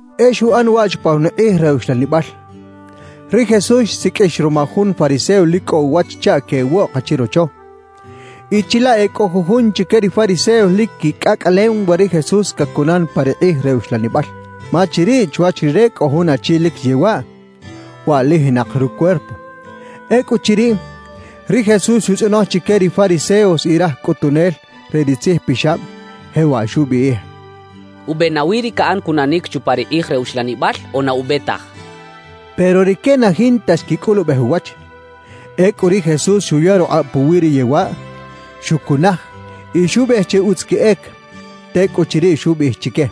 E xuꞌan waꞌ chupa jun kꞌij re uxlanibal: Ri Jesús xsiqꞌuix ruma jun fariseo lic cꞌo uwach chaꞌ queꞌwoꞌk chirocho. Y chilaꞌ e cꞌo jujun chique ri fariseos lic quicꞌacꞌalem we ri Jesús cacunan pa ri kꞌij re uxlanibal. Ma chiriꞌ chwach Rire cꞌo jun achi lic yewaꞌ, waꞌlijinak rucuerpo. Ecꞌuchiriꞌ, ri Jesús xutzꞌonoj chique ri fariseos y raj cꞌutunel re ri tzijpixab, jewaꞌ xubiꞌij: —¿Ube nawi ri caꞌan cunanic chupa ri kꞌij re uxlanibal o na ube taj? —xchaꞌ. Pero rique na jinta xquicꞌulubej uwach. Ecꞌu ri Jesús xuya rukꞌab puwi ri yewaꞌ, xucunaj y xubiꞌij che utz queꞌec. Tecꞌuchiriꞌ xubiꞌij chique: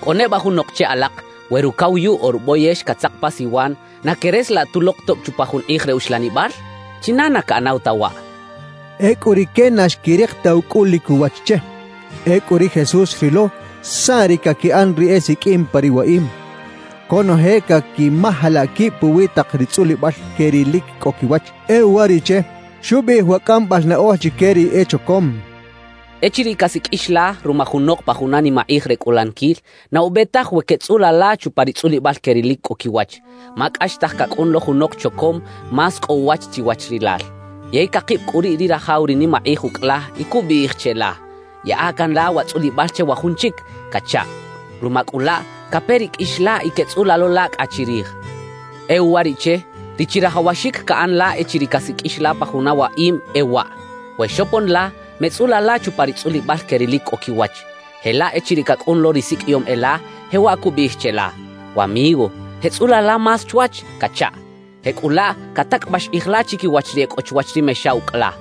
—¿Cꞌo neba junok che alak, we rucawayuꞌ o ruboyex catzak pa siwan, na queꞌresalaꞌ tulok tob chupa jun kꞌij re uxlanibal? ¿China na caꞌanaw ta waꞌ? —xchaꞌ. Ecꞌu rique na xquirik ta ucꞌulic uwach che. Ecꞌu ri Jesús xrilo saꞌ ri caquiꞌan ri esiqꞌuim pa ri waꞌim, conoje caquimajalaꞌ quib puwi tak ri tzꞌulibal que ri lic cꞌo quiwach. E uwariꞌche, xubiꞌij wa cꞌambal naꞌoj chique ri echocom: «Echiriꞌ casiqꞌuix la ruma junok pa juna nimakꞌij re cꞌulaniquil, na ube taj we queꞌtzꞌula la chupa ri tzꞌulibal que ri lic cꞌo quiwach; ma cꞌaxtaj cacꞌun lo junok chocom más cꞌo uwach chiwach rilal. Yey cakib cꞌu riꞌ ri rajaw ri nimakꞌij ucꞌ la y cubiꞌij cheꞌla: “Yaꞌa can la wa tzꞌulibal che wa jun chic” cachaꞌ. Ruma cꞌu laꞌ, cape ri qꞌuix la y queꞌtzꞌula lo la cꞌa chirij. »E uwariꞌche, ri chirajawaxic caꞌan la echiriꞌ casiqꞌuix la pa juna waꞌim e waꞌ: We xopon la, meꞌtzꞌula la chupa ri tzꞌulibal que ri lic cꞌo quiwach. Jelaꞌ echiriꞌ cacꞌun lo ri siqꞌuiyom e la, jewaꞌ cubiꞌij cheꞌla: “Wamigo, jeꞌtzꞌula la más chwach” cachaꞌ. Jecꞌulaꞌ catacꞌabax kꞌij la chiquiwach ri e cꞌo chwach ri mexa ucꞌ la.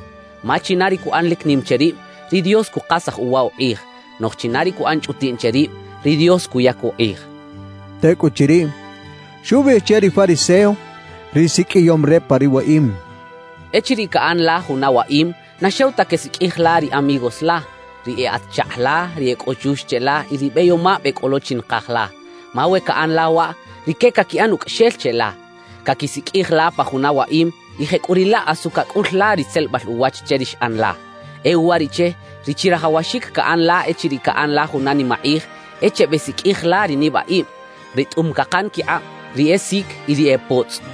Ma china ri cuꞌan lic nim che rib, ri Dios cukasaj uwa ukꞌij; noꞌj china ri cuꞌan chꞌutiꞌn che rib, ri Dios cuyac ukꞌij» xcha ri Jesús. Tecꞌuchiriꞌ, xubiꞌij che ri fariseo, ri siqꞌuiyom re pa ri waꞌim: —Echiriꞌ caꞌan la juna waꞌim, na xew ta quesiqꞌuij la ri amigos la, ri e atz-chakꞌ la, ri e cꞌo chux cheꞌla y ri beyomab e cꞌo lo chi nakaj la. Ma we caꞌan la waꞌ, rique caquiꞌan ucꞌaxel cheꞌla, caquisiqꞌuij la pa juna waꞌim y jecꞌuriꞌlaꞌ asu cacꞌul la ri tzelebal uwach che ri xꞌan la. »E uwariꞌche, ri chirajawaxic caꞌan la echiriꞌ caꞌan la juna nimakꞌij, e chebesiqꞌuij la ri nibaꞌib, ri tꞌum cakan quikꞌab, ri e sic y ri e potzꞌ.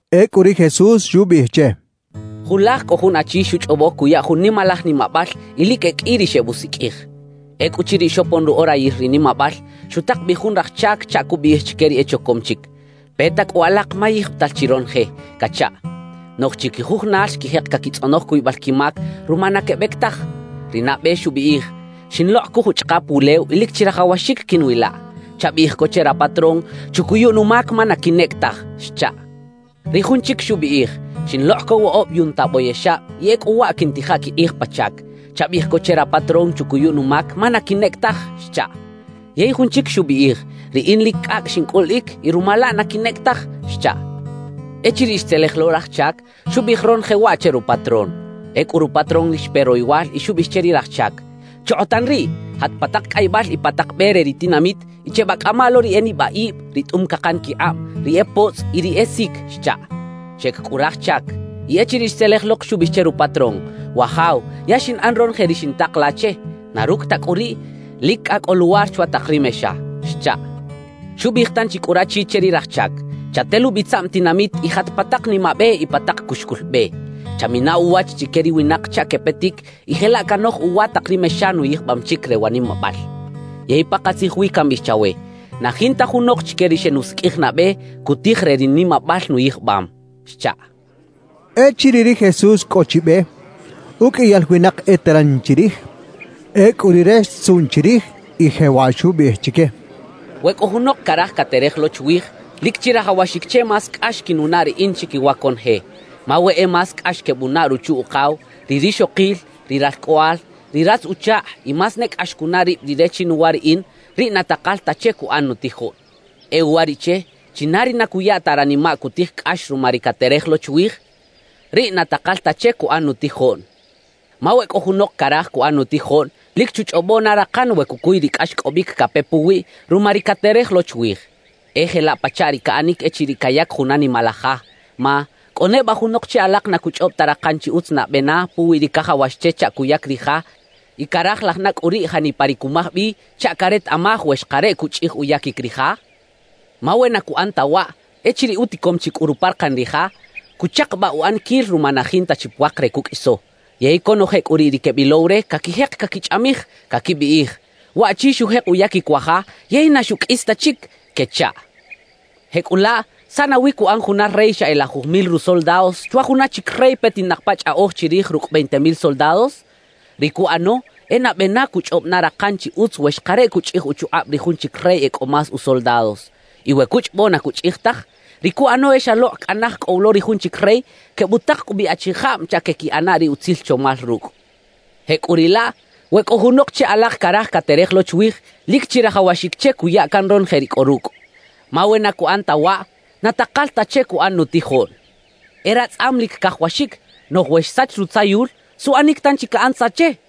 Ecꞌu ri Jesús xubiꞌij che: «Julaj cꞌo jun achi xuchꞌobo cuya jun nimalaj nimabal y lic e qꞌui ri xebusiqꞌuij. Ecꞌuchiriꞌ xopon ru orayil ri nimabal, xutak bi jun raj chac chaꞌ cubiꞌij chique ri echocom chic: “Peta cꞌu alak ma yijbital chi ronoje” cachaꞌ. »Noꞌj chiquijujunal xquijek caquitzꞌonoj cuybal quimac ruma na quebec taj. Ri nabe xubiꞌij: “Xinlokꞌ co juchꞌakap wulew y lic chirajawaxic quiꞌnwilaꞌ. Chabiꞌij co che rapatrón chucuyu numac ma na quinꞌec taj” xchaꞌ. »Ri jun chic xubiꞌij: “Xinlokꞌ co woꞌob yunta boyexab y ecꞌu waꞌ quiꞌntija quikꞌij pa chac. Chabiꞌij co che rapatrón chucuyu numac ma na quinꞌec taj” xchaꞌ. »Yey jun chic xubiꞌij: “Riꞌin lic cꞌacꞌ xincꞌuliꞌic; y ruma laꞌ na quinꞌec taj” xchaꞌ. »Echiriꞌ xtzelej lo raj chac, xubiꞌij ronoje waꞌ che rupatrón. Ecꞌu rupatrón lic xpe royowal y xubiꞌij che ri raj chac: “Chokꞌotan riꞌ, jat pa tak cꞌaybal y pa tak be re ri tinamit y chebacꞌama lo ri e nibaꞌib, ri tꞌum cakan quikꞌab, ri e potzꞌ y ri e sic” xchaꞌ. »Xeꞌec cꞌu raj chac. Y echiriꞌ xtzelej lok, xubiꞌij che rupatrón: “Wajaw, ya xinꞌan ronoje ri xintak la che; na rucꞌ ta cꞌu riꞌ, lic cꞌa cꞌo luwar chwa tak ri mexa” xchaꞌ. »Xubiꞌij tanchi cꞌu rachi che ri raj chac: “Chatelubi tzaꞌm tinamit y jat pa tak nimabe y pa tak cuxcul be. Chamina uwach chique ri winak chaꞌ quepetic y jelaꞌ canoj uwa tak ri mexa nuyijbam chic re wa nimabal. Yey pakatzij wi cambiꞌij chawe: Na jinta junok chique ri xenusiqꞌuij nabe, cutij re ri nimabal nuyijbam” xchaꞌ.» Echiriꞌ ri Jesús cꞌo chi be, uqꞌuiyal winak eteran chirij. Ecꞌu Rire xtzuꞌn chirij y jewaꞌ xubiꞌij chique: «We cꞌo junok caraj caterej lo chwij, lic chirajawaxic che más cꞌax quinunaꞌ riꞌin chiquiwa conoje, ma we e más cꞌax quebunaꞌ ruchu-ukaw, ri rixokil, ri ralcꞌoꞌal, ri ratz-uchakꞌ y más ne cꞌax cunaꞌ rib rire chinuwa riꞌin, riꞌ na takal ta che cuꞌan nutijoꞌn. E uwariꞌche, china ri na cuya ta ranimaꞌ cutij cꞌax ruma ri caterej lo chwij, riꞌ na takal ta che cuꞌan nutijoꞌn. »Ma we cꞌo junok caraj cuꞌan nutijoꞌn, lic chuchꞌobo na rakan we cucuy ri cꞌaxcꞌobic cape puwiꞌ ruma ri caterej lo chwij. »E jelaꞌ pachaꞌ ri caꞌanic echiriꞌ cayac juna nimalaj ja. Ma ¿cꞌo neba junok che alak na cuchꞌob ta rakan chi utz nabe na puwi ri cajawax che chaꞌ cuyac ri ja y carajilaj na cꞌu riꞌ janipa ri cumaj bi chaꞌ caretaꞌmaj we xakareꞌ cuchꞌij uyaquic ri ja? Ma we na cuꞌan ta waꞌ, echiriꞌ uticom chi cꞌu ruparakan ri ja, cuchakabaꞌ uꞌaniquil ruma na jinta chi puak re cuqꞌuiso; yey conoje cꞌu riꞌ ri quebilow re, caquijek caquichꞌamij, caquibiꞌij: “Waꞌchi xujek uyaquic wa ja, yey na xuqꞌuis ta chic” quechaꞌ. »Jecꞌulaꞌ ¿saꞌ nawi cuꞌan juna rey xa e lajuj mil rusoldados chwa juna chic rey petinak pa chꞌaꞌoj chirij rucꞌ veinte mil soldados? Ri cuꞌano e nabe na cuchꞌob na rakan chi utz we xakareꞌ cuchꞌij uchukꞌab ri jun chic rey e cꞌo más usoldados. Y we cuchꞌobo na cuchꞌij taj, ri cuꞌano e xalokꞌ cꞌa naj cꞌo wi lo ri jun chic rey, quebutak cꞌu bi achijab chaꞌ queꞌquiꞌana ri utzil chomal rucꞌ. Jecꞌuriꞌlaꞌ, we cꞌo junok che alak caraj caterej lo chwij, lic chirajawaxic che cuya can ronoje ri cꞌo rucꞌ; ma we na cuꞌan ta waꞌ, na takal ta che cuꞌan nutijoꞌn. »E ratzꞌam lic cajawaxic; noꞌj we xsach rutzayul, ¿suꞌanic tanchi caꞌan tza che?